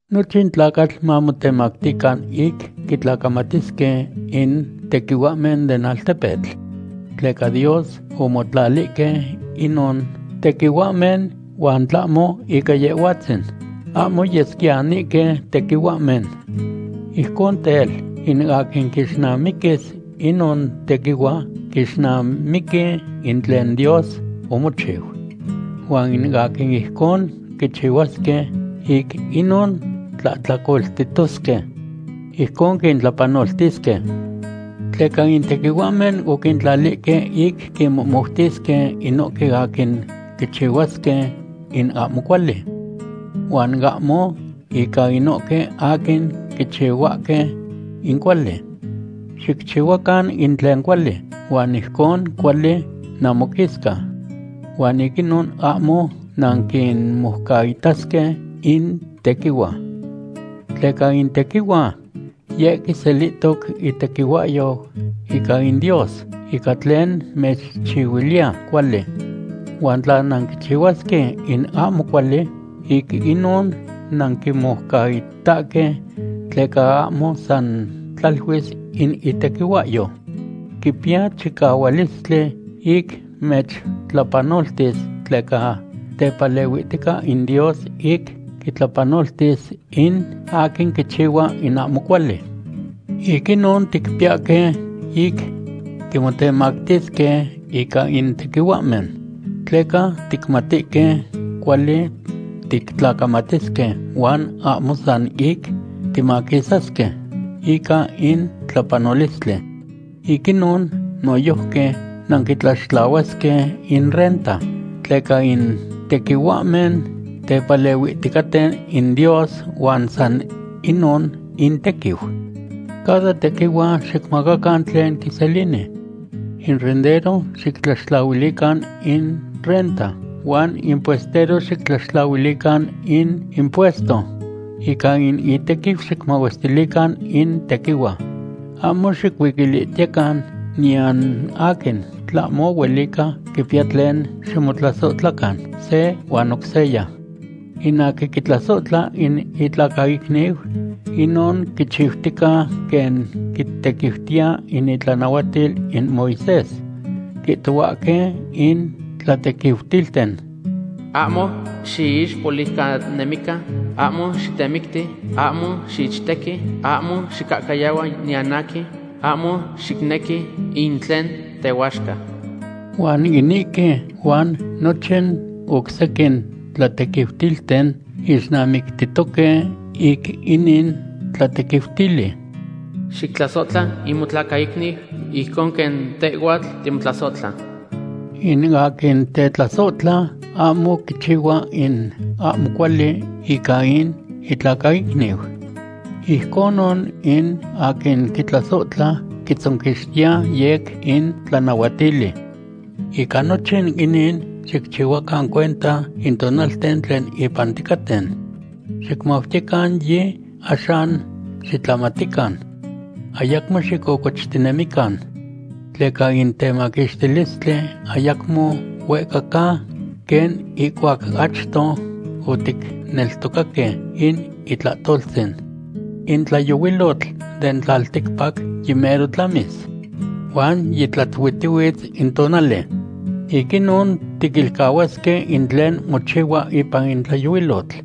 Nochin tlacatl mamotemactican ic quitlacamatisque in tequihuahmen den altepetl. Tleca Dios omotlalihque inon tequihuahmen huan tlahmo ica Yehhuatzin, ahmo yesquiyanihque tequihuahmen. Ijcon tel, in aquin quixnamiquis inon tequihua quixnamiqui in tlen Dios omochiu. Huan in aquin ijcon quichihuasque, ic inon tlahtlacoltitosque. Ijcon quintlapanoltisque. Tleca in tequihuahmen oquintlalihque ic quinmohmoutisque inohque aquin quichihuasque in ahmo cuali, huan ahmo ica inohque aquin quichihuahque in cuali. Xicchihuacan in tlen cuali, huan ijcon cuali namoquisca. Huan ic inon ahmo nanquimoucaitasque in tequihua. Tleca in tequihua, yeh quiselihtoc itequihuahyo ica in Dios ica tlen mechchihuiliya cuali. Huan tla nanquichihuasque in ahmo cuali, ic inon nanquimoucaitahque tleca ahmo san tlaluis in itequihuahyo. Quipiya chicahualistli ic mechtlapanoltis tleca tepalehuihtica in Dios ic quitlapanoltis in aquin quichihua in ahmo cuali. Ic inon ticpiyahque ic timotemactisque ica in tequihuahmen, tleca ticmatihque cuali tictlacamatisque huan ahmo san ic timaquisasque ica in tlapanolistli. Ic inon noyojqui nanquitlaxtlahuasque in renta, tleca in tequihuahmen tepalehuihticaten in Dios huan san inon intequiu. Cada tequihua xicmacacan tlen quiselini. In rendero xictlaxtlahuilican in renta huan in puestero xictlaxtlahuilican in impuesto. Ica in itequiu xicmahuestilican in tequihua. Ahmo xicuiquilihtiyecan niyan aquin, tlahmo huelica quipiya tlen ximotlasohtlacan se huan oc seya. In aquin quitlasohtla in itlacaicniu, inon quichiutica quen quitequiutiya in itlanahuatil in Moisés. Quihtohuahque in tlatequiutilten: “Ahmo xiixpoliucanemican, ahmo xitemicti, ahmo xiichtequi, ahmo xicahcayahua niyan aquin, ahmo xicnequi in tlen tehuaxca.” Huan inihque huan nochin oc sequin tlatequiutilten ixnamictitoque ic inin tlatequiutili: “Xictlasohtla in motlacaicniu ijcon quen tehhuatl timotlasohtla.” In aquin tetlasohtla ahmo quichihua in ahmo cuali ica in itlacaicniu. Ijconon in aquin tetlasohtla quitzonquixtiya yec in tlanahuatili. Ica nochin inin xicchihuacan cuenta in tonalten tlen ipan ticaten. Xicmautiyecan yi axan xitlamatican. Ayacmo xicocochtinemican. Tleca in temaquixtilistli ayacmo huehca ca quen ihcuac achto oticneltocaque in itlahtoltzin. In tlayohuilotl den tlalticpac yimero tlamis, huan yitlatuitihuitz in tonali. Ic inon tiquilcahuasque in tlen mochihua ipan in tlayohuilotl,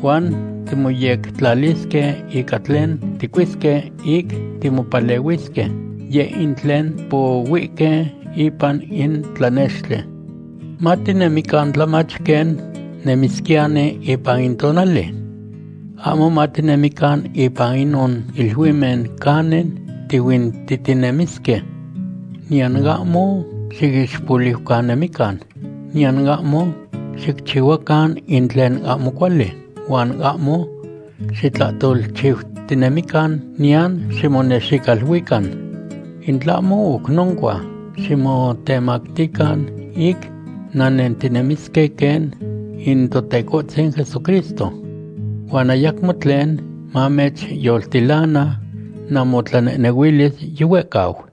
huan timoyectlalisque ica tlen ticuisque ic timopalehuisque, yeh in tlen pohuihque ipan in tlanextli. Matinemican tlamach quen nemisquiyani ipan in tonali. Ahmo matinemican ipan inon iluimen canin tihuintihtinemisque. Niyan ahmo xiixpoliucanemican, niyan ahmo xicchihuacan in tlen ahmo cuali huan ahmo xitlahtolchiutinemican, niyan ximonexicaluican. In tlahmo oc noncua, ximotemactican ic nannentinemisque quen in Totecohtzin Jesucristo. Huan ayacmo tlen mamechyoltilana namotlanehnehuilis yihuehcau.